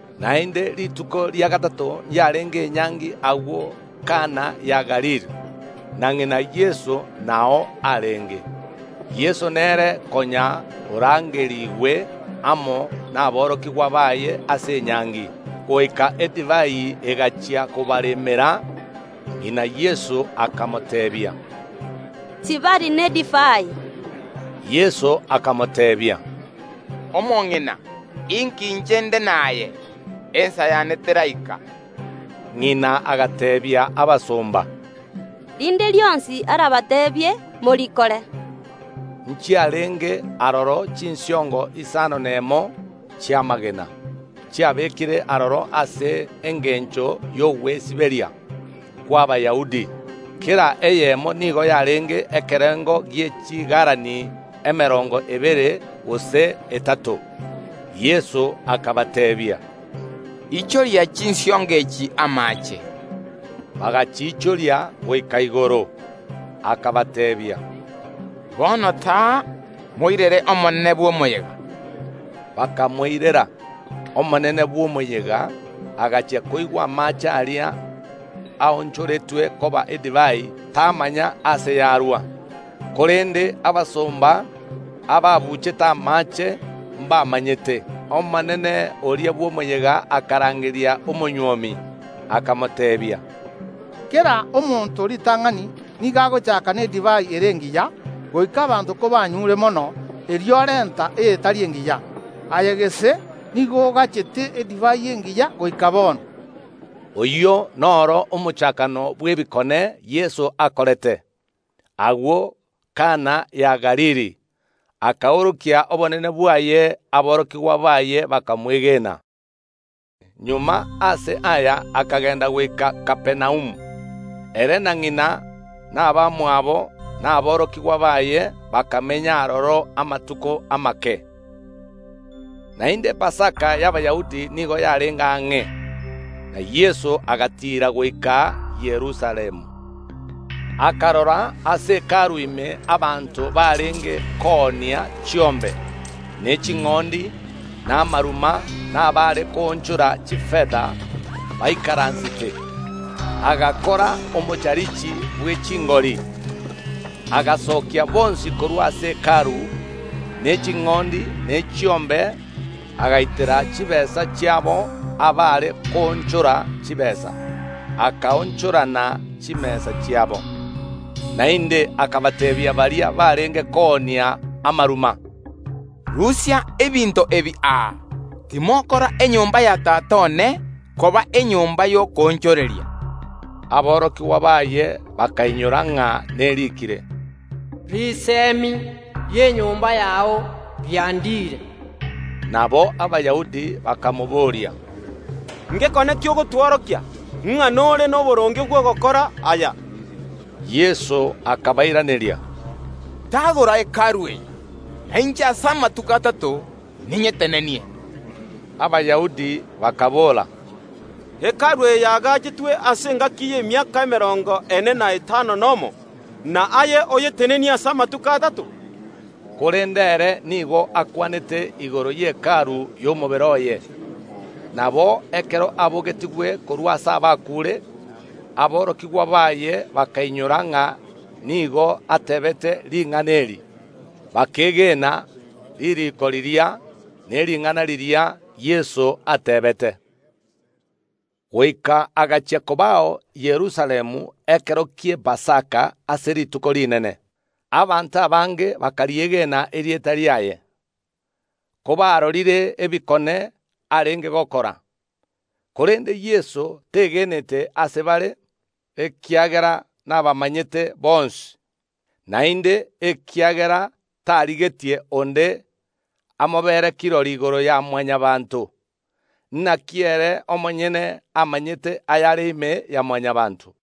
Naende rituko ria gatato ’yarenge enyangi agwo Kana ya Galili, na ng’ina Yeso nao arenge. Yeso nere konya orangeriigwe amo naborokigwa baye ase enyangi. Goika edivai egachia kobaremera, ng’ina Yeso akamoteebia, “Tibari nedivai.” Yeso akamoteebia, “Omong’ina, inki inche nde naye? Ensa yane teraika.” Ng’ina agateebia abasomba, “Rinde rionsi arabateebie, morikore.” Nchiarenge aroro chinsiongo isano nemo chi’amagena, chiabekire aroro ase engencho y’ogwesiberia kw’Abayahudi; kera eyemo nigo yarenge ekerengo gie chigalani emerongo ebere gose etato. Yeso akabateebia, “Ichoria chinsiongo echi amaache.” Bagachiichoria goika igoro. Akabateebia, Bono taoria, “moirere omonene bw’omoyega.” Bakamoirera. Omonene bw’omoyega agachia koigwa amaache aria aonchoretwe koba edivai, tamanya aase yarwa, (korende abasomba ababuuchete amaache mbamanyete). Omonene oria bw’omoyega akarangeria omonywomi, akamoteebia, “Kera omonto ritang’ani nigo agochaaka nedivai ere engiya, goika abanto kobanyuure mono, erio orenta eyetari engiya; aye gese nigo ogachete edivai engiya goika bono.” Oyio noro omochakano bw’ebikone Yeso akorete, agwo Kana ya Galili, akaorokia obonene bwaye; aborokigwa baye bakamwegena. Magega ase aya akagenda goika Kapernaumu, ere, na ng’ina, na abamwabo, na aborokigwa baye; bakamenya aroro amatuko amake. Naende Epasaka y’Abayahudi nigo yarenge ang’e, na Yeso agatiira goika Yerusalemu. Akarora ase Hekalu ime abanto barenge koonia chiombe, ne ching’ondi, na amaruma, na abaare koonchora chifeta, baikaransete. Agakora omocharichi bwe chingori, akabasokia bonsi korwa ase Hekalu, ne ching’ondi, ne chiombe; agaitera chitaabu chiabo abaare koonchora chitaabu, akaonchorana chimesa chiabo. Naende akabateebia baria barenge koonia amaruma, “Rusia ebinto ebi aa timokora enyomba ya Tata one koba enyomba y’okoonchoreria.” Aborokigwa baye bakainyora ng’a neriikire, “Risemi ri’enyomba yao riandire.” Nabo Abayahudi bakamobooria, “Ngekone ki ogotworokia, ng’a nore noboronge bw’ogokora aya?” Yeso akabairaneria, “Tagora Hekalu eye, na inche ase amatuko atato ninyetenenie.” Abayahudi bakaboora, “Hekalu eye yaagachetwe ase engaki y’emiaka emerongo ene na etano nomo, na aye oyetenenie ase amatuko atato?” Korende ere nigo akwanete igoro ye Hekalu y’omobere oye. Nabo ekero abogetigwe korwa ase abakuure aborokigwa baye bakainyora ng’a nigo ateebete ring’ana eri, bakegena ririiko riria, ne ring’ana riria Yeso ateebete. Goika agachia kobao Yerusalemu ekero ki’Epasaka ase Rituko Rinene, abanto abange bakariegena erieta riaye, kobarorire ebikone arenge gokora. Korende Yeso tegenete ase bare, ekiagera nabamanyete bonsi, naende ekiagera tarigetie onde amobere kirori igoro ya Mwanyabaanto; naki ere omonyene amanyete ayare ime ya Mwanyabaanto.